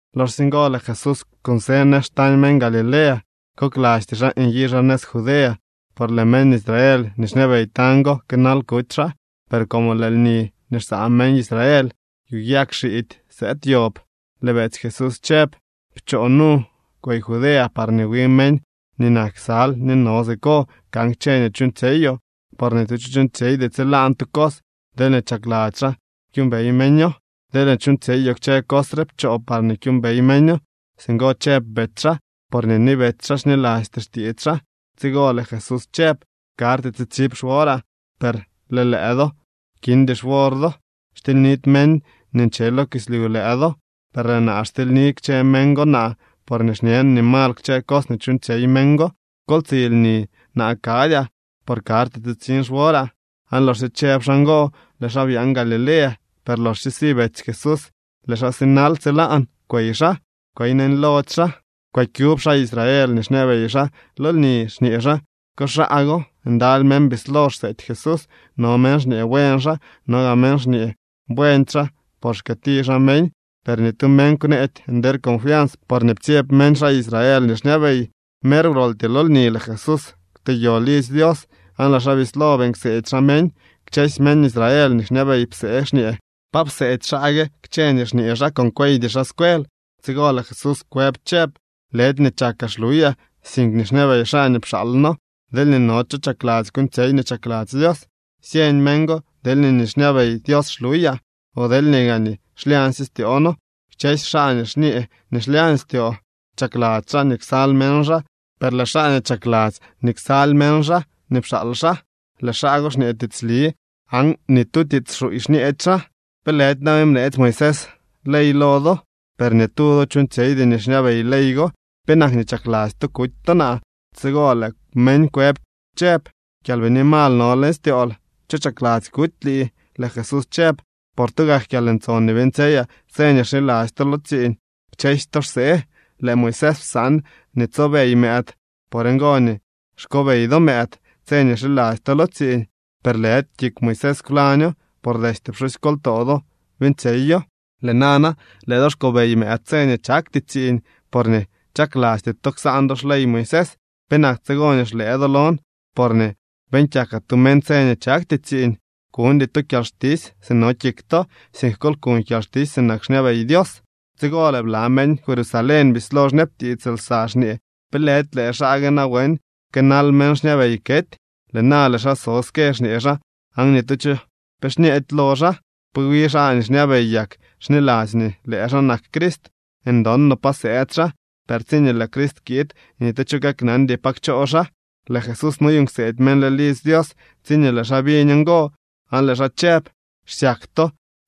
Loxsye ngo, lëë Jesús kunsë nëz xtañ meñ Galilea. Koklasty xaa nyi xaa nëz Judea, por lëë meñ Israel nii xñabey tañ go kënal kuty xaa. Per como lëë lni nii xsaa meñ Israel yu yag xiidy sëëd yob, lëë betsy Jesús chëb: —Pchoo nu, kwey Judea parñee wi meñ nii nak ksal nii no siko kan kchë nii chuuñtsyeyoo. Por ni tu cho chuuñtsyeydy tsilaan tu cos deelñee chakladzy xaa kyuumbey meño. Deelñee chuuñtsyeyoo kchë cos re, pchoo parñee kyuumbey meño. Singo chëb betsy xaa, porñee ni betsy xaa xnilasty xtiits xaa. Tsigo lëë Jesús chëb: —Karty tsitsib xworaa, per lëë lëë do kindy xwor do. Xtilynidy meñ nii nche lo kislyu lëë do. Per lëë naa, xtilyni kchë meñ go naa porñee xñen nii mal kchë cos nii chuuñtsyey meñ go. Kol tsi lni. Naa kadyaa, por karty tsitsiñ xworaa. Aan loxsye chëb xaa ngo, lëë xaa byaan Galilea. Per loxsye si betsy Jesús, lëë xaa sinal. Tsilaan kwey xaa, kwey neñlody xaa. Kwëkyub xaa Israel nii xñabey xaa lo lni, xñee xaa: —¿Ko xaa go? Ndaly meñ bislo xseety Jesús. No meñ xñee: “Buen xaa.” No gaa meñ xñee: “Buendy xaa por xkëëti xaa meñ.” Per ni tu meñ kwneedy nder confians, porñee ptsyeb meñ xaa Israel nii xñabey. Mer wroltyee lo lni lëë Jesús kwteyo lidzy Dios aan lëë xaa bislo beeñ kseedy xaa meñ. Kchësy meñ Israel nii xñabey psee xñee: —¿Pa pseedy xaa gue kchë nii xñee xaa con kweydy xaa scuel? Tsigo lëë Jesús kwëb chëb: —Lëdy nii chakaa xluyaa, sink nii xñabey xaa nii pxaalno. Deelñee no cho chakladzy kuuñtsyey nii chakladzy Dios, syeñ meñ go deelñee nii xñabey Dios xluyaa o deelñee gaa nii xlyañsye styoono. Kchësy xaa nii xñee nii xlyañ leñ styoo chakladzy xaa nii ksal meñ xaa, per lëë xaa nii chakladzy nii ksal meñ xaa nii pxaal xaa, lëë xaa go xñee tiitsli aan ni tu tiits xuuy xñeedy xaa. ’¿Pe lëdy nawen bneetsy Moisés ley lo do? Per ni tu do chuuñtsyeydy nii xñabey ley go. ¿Penak nii chakladzy to kuty to naa? Tsigo lëë meñ kwëb chëb: —Kyalbini mal no leñ styool. ¿Cho chakladzy kuty lii? Lëë Jesús chëb: —Por tugak kyalntson nii beeñtsyeyaa tse nii xiladzy to lo tsiiñ, kchësy to xsee. Lëë Moisés psaan nii tsobey mëëd. Por ngo nii xkobey do mëëd tse nii xiladzy to lo tsiiñ, per lëdy kik Moisés kwlaño, por destye pxusykoltoo do beeñtsyeyo. Lëë nana, lëë do xkobey mëëd tse nii chakty tsiiñ porñee chaklasty to ksaan do xley Moisés. ¿Penak tsigo nii xlëë do lon porñee beeñ kyakaa tu meñ tse nii chakty tsiiñ? Kuñdy to kyalxtisy si no kik to, sink kol kuñ kyalxtisy sinak xñabey Dios. Tsigo lëë bla meñ Jerusalén bislo xñabtiits lsa, xñee: —¿Pe lëdy lëë xaa gue nawen kënal meñ xñabey kety? Lëë na lëë xaa so ske xñee xaa aan ni tu cho pe xñeedy lo xaa. ¿Pe wi xaa nii xñabey yak xniladzy nii nli lëë xaa nak Crist? Ndon no pa sëëd xaa, per tsiñee lëë Crist kiid, ni tu cho kaknandy pa kchoo xaa. Lëë Jesús noyuuñ kseedy meñ leñ lidzy Dios tsiñee lëë xaa biñ ngo, aan lëë xaa chëb: —¡Xsyak to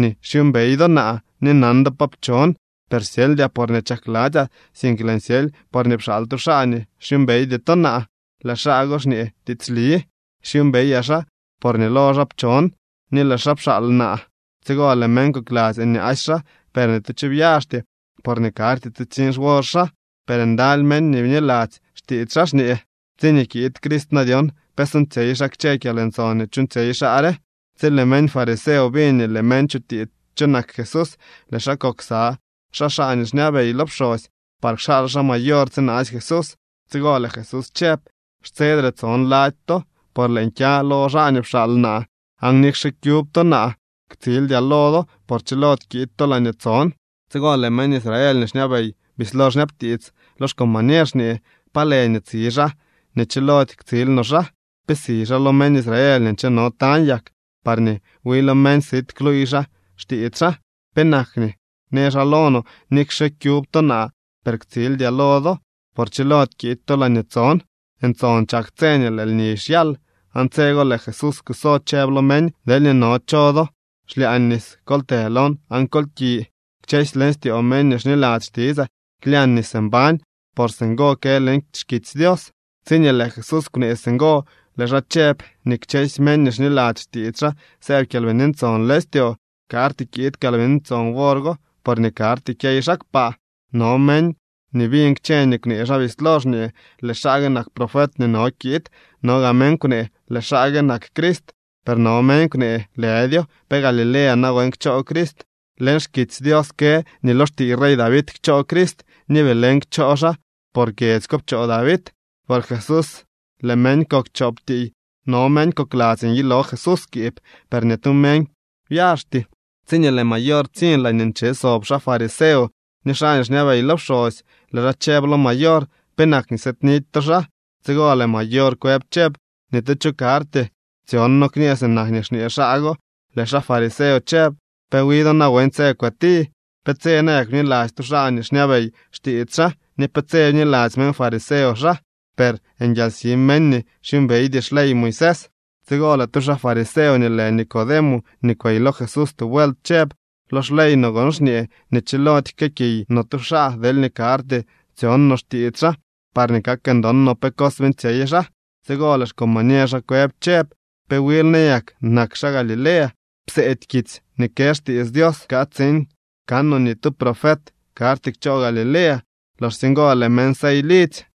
nii xyuumbey do naa ni nan do pa pchon! Per syeldyaa porñee chakladzyaa, sink lëën syely porñee pxaal tu xaa nii xyuumbeydy to naa. Lëë xaa go xñee tiitsli. Xyuumbeyaa xaa porñee lo xaa pchon, ni lëë xaa pxaal naa. Tsigo lëë meñ kokladzy nyaasy xaa, per ni tu cho byaxty, porñee karty tsitsiñ xwor xaa. Per ndaly meñ nii bniladzy xtiits xaa, xñee: —Tsiñee kiid Crist na dyon, ¿pe suuñtsyey xaa kchë kyalntson nii chuuñtsyey xaa re? Tsi lëë meñ fariseo biñ nii lëë meñ chutiits cho nak Jesús, lëë xaa kok ksa xaa nii xñabey lo pxosy par kxaal xaa mayor tsinaasy Jesús. Tsigo lëë Jesús chëb: —Xtsedre tson lady to, por lëën kya lo xaa nii pxaal naa. Aan nikxe kyub to naa, ktsildyaa lo do, por chilody kiid to laañee tson. Tsigo lëë meñ Israel nii xñabey bislo xñabtiits lo xcombañer xñee: —¿Pa lë nii tsi xaa nii chilody ktsil no xaa? ¿Pe si xaa lo meñ Israel nii ncheno tañ yak parñee wi lo meñ sit kluuy xaa xtiits xaa? ¿Penak nii në xaa lo no: “Nikxe kyub to naa, per ktsildyaa lo do, por chilody kiid to laañee tson”? Ntson chak tse nii lëë lni xyal, aan tse go lëë Jesús kuso chëb lo meñ: —Deelñee no cho do xlyaa nis, kol të lon aan kol ki. Kchësy leñ styoo meñ nii xniladzy xtitsaa klyañ nis mbañ, por singo kë leñ xkitsy Dios. Tsiñee lëë Jesús kwnee singo, lëë xaa chëb nii kchësy meñ nii xniladzy xtiits xaa sëëb Kyalbini Ntson leñ styoo. Karty kiid Kyalbini Ntson wor go, porñee karty kyey xaa kpaa. No meñ nii biñ kchë nii kwnee xaa bislo xñee: —Lëë xaa gue nak profet nii no kiid. No gaa meñ kwnee: —Lëë xaa gue nak Crist. Per no meñ kwnee: —Lëdyo. ¿Pe Galilea nawen kchoo Crist? Leñ xkitsy Dios kë nii lo xtiiy rey David kchoo Crist, ni Belén kchoo xaa, por kyedzy ko pchoo David. Por Jesús lëë meñ kok chop tiiy. No meñ kokladzy nyilo Jesús skiib, per ni tu meñ byaxty. Tsiñee lëë mayor ptsiñ laañee nche sob xaa fariseo ni xaa nii xñabey lo pxosy, lëë xaa chëb lo mayor: —¿Penak nii sëëdnidy to xaa? Tsigo lëë mayor kwëb chëb: —¡Ni tu cho karty tsyon noo kñee sinak nii xñee xaa go! Lëë xaa fariseo chëb: —¿Pe wi do nawen tse kwëti? ¿Pe tse nayak bniladzy tu xaa nii xñabey xtiits xaa, ni pe tse bniladzy meñ fariseo xaa? Per nguialsi meñ nii xyuumbeydy xley Moisés. Tsigo lëë tu xaa fariseo nii lë Nicodemo nii kwey lo Jesús tu vuelt chëb: —Lo xley no gon xñee nii chilody jkëëkiy no tu xaa deelñee karty tsyon no xtiits xaa parñee kak ndon no pe cos beeñtsyey xaa. Tsigo lëë xcombañer xaa kwëb chëb: —¿Pe wil nayak nak xaa Galilea? Pseedy kitsy nii kë xtiits Dios kaa tsiin kanoo nii ni tu profet karty kchoo Galilea. Loxsye ngo lëë meñ sey lidzy.